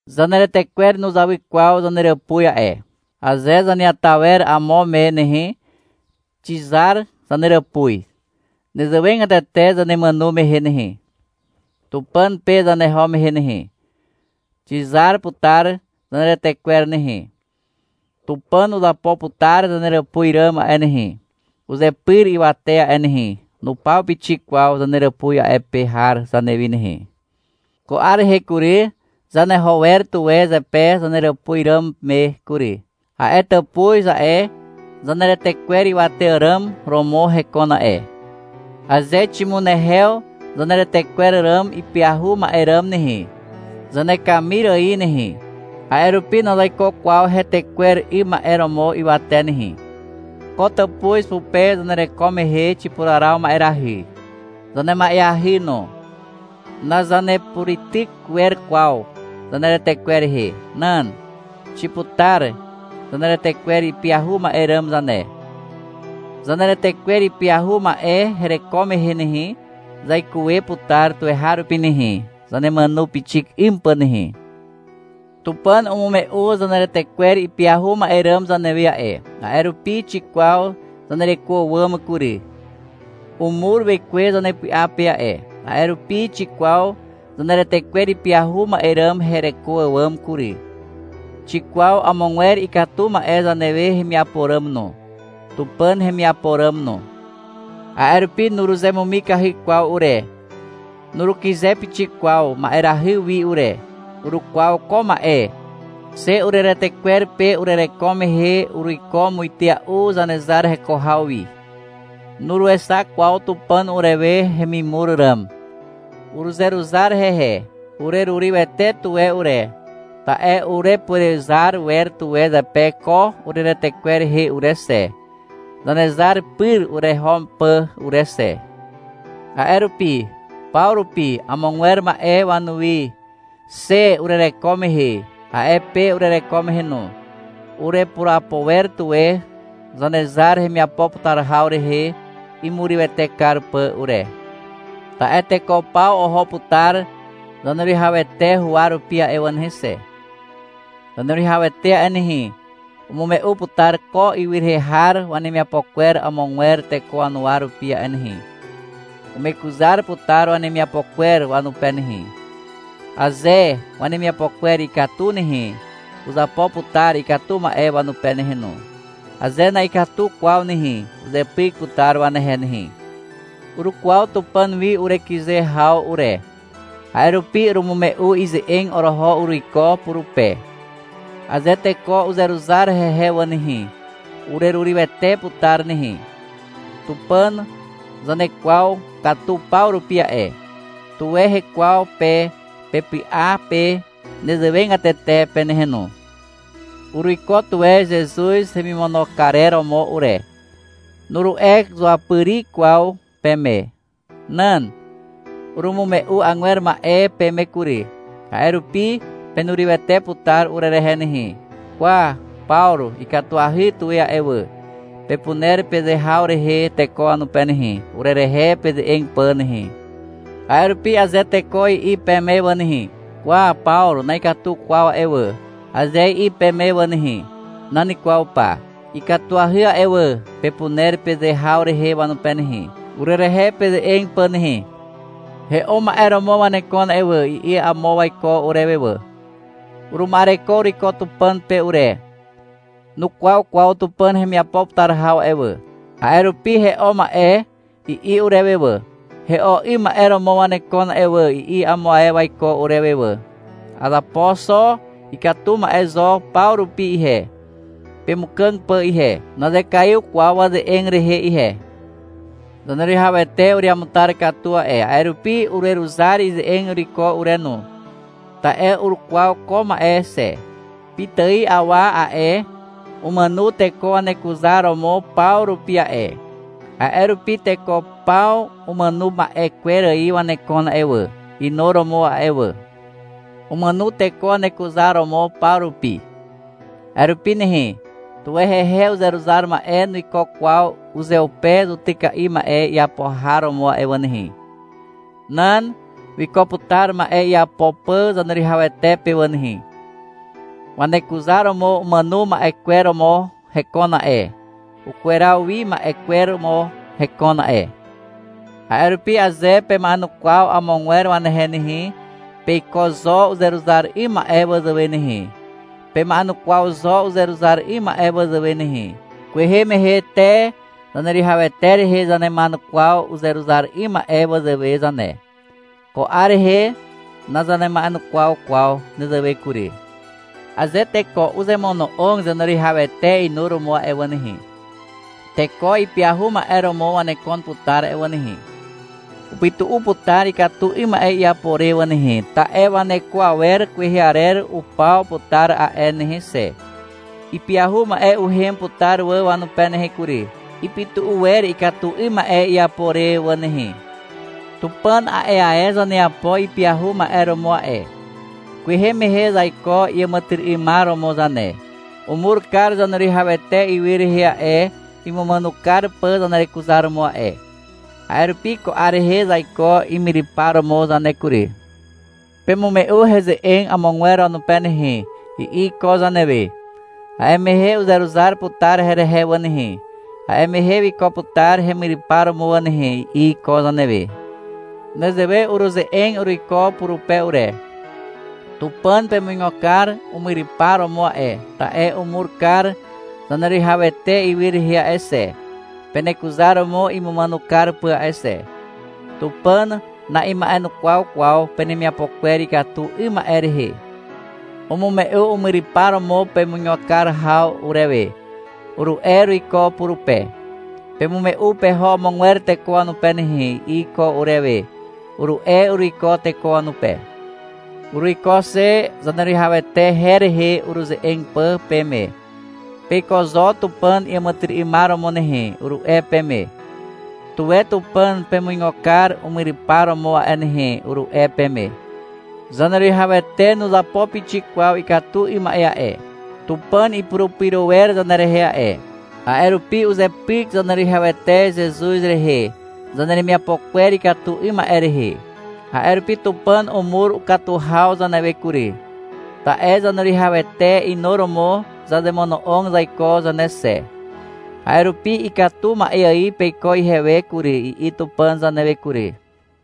Zaneretekwer nuzawy kwaw zaneràpuz a'e. Aze zaneata wer amo me nehe, xizar zaneràpuz. Nezewegatete zanemàno mehe nehe, Tupàn pe zaneho mehe nehe, xizar putar zaneretekwer nehe. Tupàn uzapo putar zaneràpuz ràm a'e nehe, uzepyr ywate a'e nehe. Nupaw pixik kwaw zaneràpuz a'e pe har zanewi nehe. Ko 'ar rehe kury, zaneho wer tuwe zepe zaneràpuz ràm me kury. A'e tàpuz a'e, zaneretekwer ywate àràm romo hekon a'e. Aze ximunehew zaneretekwer ràm ipyahu ma'e ràm nehe, zanekamir ài nehe. A'e rupi nazaiko kwaw hetekwer 'ym ma'e romo ywate nehe. Ko tàpuz pupe zanereko mehe xipuraraw ma'erahy. Zanema'eahy no. Nazanepureityk wer kwaw zaneretekwer rehe. Nan. Xiputar zaneretekwer ipyahu ma'e ràm zane. Zaneretekwer ipyahu ma'e hereko mehe nehe, zaikuwe putar tuweharupi nehe, zanemàno pixik 'ym pà nehe. Tupàn umume'u zaneretekwer ipyahu ma'e ràm zanewe a'e. A'e rupi xikwaw zanereko àwàm kury. Umur Wekwe zanepy'a pe a'e. A'e rupi xikwaw zaneretekwer ipyahu ma'e ràm hereko àwàm kury. Xikwaw amogwer ikatu ma'e zanewe hemiapo ràm no, Tupàn hemiapo ràm no. A'e rupi nuruzemumikahy kwaw ure, nurukyze pixik kwaw ma'erahy wi ure. Urukwaw ko ma'e. Xe ureretekwer pe urereko mehe, uruiko muitea'u Zanezar heko haw wi. Nuruexak kwaw Tupàn urewe hemimur ràm. Uruzeruzar hehe. Urerurywete tuwe ure, ta'e urepurezar wer tuwe zepe ko ureretekwer rehe ure xe, Zanezar pyr ureho pà ure xe. A'e rupi, paw rupi amogwer ma'e wanuwi, xe urereko mehe, a'e pe urereko mehe no, urepurapo wer tuwe Zanezar hemiapo putar haw rehe, imurywete kar pà ure. Ta'e teko paw oho putar Zaneruwihawete huwa rupi a'e wà nehe xe. Zaneruwihawete a'e nehe, umume'u putar ko ywy rehe har wanemiapo kwer amogwer teko wanuwa rupi a'e nehe. Umekuzar putar wanemiapo kwer wanupe nehe. Aze wanemiapo kwer ikatu nehe, uzapo putar ikatu ma'e wanupe nehe no. Aze na'ikatu kwaw nehe, uzepyk putar wanehe nehe. Urukwaw Tupàn wi urekyze haw ure. A'e rupi urumume'u ize'eg oroho uruiko purupe. Aze teko uzeruzar hehe wà nehe, urerurywete putar nehe. Tupàn zanekwaw katu paw rupi a'e. Tuwe hekwaw pe pepy'a pe nezewegatete pe nehe no. — Uruiko tuwe Zezuz hemimono karer romo ure, nuru'e zuapyri kwaw peme. Nan. Urumume'u agwer ma'e peme kury, a'e rupi penurywete putar urerehe nehe. — Kwa, Pawru ikatuahy tuwe a'e wà, pepuner peze haw rehe teko wanupe nehe, urerehe peze'eg pà nehe. A'e rupi aze teko i'i peme wà nehe, — Kwa, Pawru na'ikatu kwaw a'e wà, aze i'i peme wà nehe, — Nan kwaw pa. Ikatuahy a'e wà, pepuner peze haw rehe wanupe nehe, urerehe peze'eg pà nehe. — He'o ma'e romo wanekon a'e wà, i'i amo waiko urewe wà. Uruma'ereko uruiko Tupàn pe ure. (Nukwaw kwaw Tupàn hemiapo putar haw a'e wà, a'e rupi — He'o ma'e, i'i urewe wà.) — He'o 'ym ma'e romo wanekon a'e wà, i'i amo ae waiko urewe wà. Azapo xo ikatu ma'e zo paw rupi ihe, pemukàg pà ihe. (Nazekaiw kwaw waze'eg rehe ihe.) Zaneruwihawete ureamutar katu a'e, a'e rupi ureruzar ize'eg uruiko ure no. Ta'e urukwaw ko ma'e xe. Pitài awa a'e, umàno teko wanekuzaromo paw rupi a'e. A'e rupi teko paw umàno ma'e kwer ài wanekon a'e wà, inuromo a'e wà. Umàno teko wanekuzaromo paw rupi. A'e rupi nehe, tuwe hehe uzeruzar ma'e nuiko kwaw uzeupe zutyka'i ma'e iapo har romo a'e wà nehe. Nan. Wiko putar ma'e iapo pà Zaneruwihawete pe wà nehe. Wanekuzaromo umàno ma'e kwer romo hekon a'e. Ukweraw wi ma'e kwer romo hekon a'e. A'e rupi aze pema'enukwaw amogwer wanehe nehe, peiko zo uzeruzar 'ym ma'e wazàwe nehe. Pema'enukwaw zo uzeruzar 'ym ma'e wazàwe nehe. Kwehe mehe te Zaneruwihawete rehe zanema'enukwaw uzeruzar 'ym ma'e wazàwe zane. Ko 'ar rehe nazanema'enukwaw kwaw nezewe kury. Aze teko uzemono'og Zaneruwihawete inuromo a'e wà nehe, teko ipyahu ma'e romo wanekon putar a'e wà nehe. Upytu'u putar ikatu 'ym ma'e iapo re wà nehe, ta'e waneko awer kwehe arer upaw putar a'e nehe xe. Ipyahu ma'e uhem putar wà wanupe nehe kury. Ipytu'u wer ikatu 'ym ma'e iapo re wà nehe. Tupàn a'e ae zaneapo ipyahu ma'e romo a'e. Kwehe mehe zaiko iàmàtyry'ymar romo zane. Umur kar Zaneruwihawete ywy rehe a'e, imumàno kar pà zanerekuzaromo a'e. A'e rupi ko 'ar rehe zaiko imyrypar romo zane kury. Pemume'u heze'eg amogwer wanupe nehe, i'i iko zanewe. — A'e mehe uzeruzar putar herehe wà nehe, a'e mehe wiko putar hemyrypar romo wà nehe, i'i iko zanewe. Nezewe uruze'eg uruiko purupe ure. — Tupàn pemuigo kar umyrypar romo a'e, ta'e umur kar Zaneruwihawete ywy rehe a'e xe, penekuzaromo imumàno kar pà a'e xe. Tupàn na'ima'enukwaw kwaw penemiapo kwer ikatu 'ym ma'e rehe. Umume'u umyrypar romo pemuigo kar haw urewe, uru'e uruiko purupe. — Pemume'u peho amogwer teko wanupe nehe, i'i iko urewe, uru'e uruiko teko wanupe. Uruiko xe Zaneruwihawete her rehe uruze'eg pà peme. — Peiko zo Tupàn iàmàtyry'ymar romo nehe, uru'e peme. — Tuwe Tupàn pemuigo kar umyrypar romo a'e nehe, uru'e peme. Zaneruwihawete nuzapo pixik kwaw ikatu 'ym ma'e a'e. Tupàn ipurupyro wer zanerehe a'e. A'e rupi uzepyk Zaneruwihawete Zezuz rehe, zaneremiapo kwer ikatu 'ym ma'e rehe. A'e rupi Tupàn umur ukatu haw zanewe kury, ta'e Zaneruwihawete inuromo zazemono'og zaiko zane xe. A'e rupi — Ikatu ma'e ài peiko ihewe kury, i'i Tupàn zanewe kury.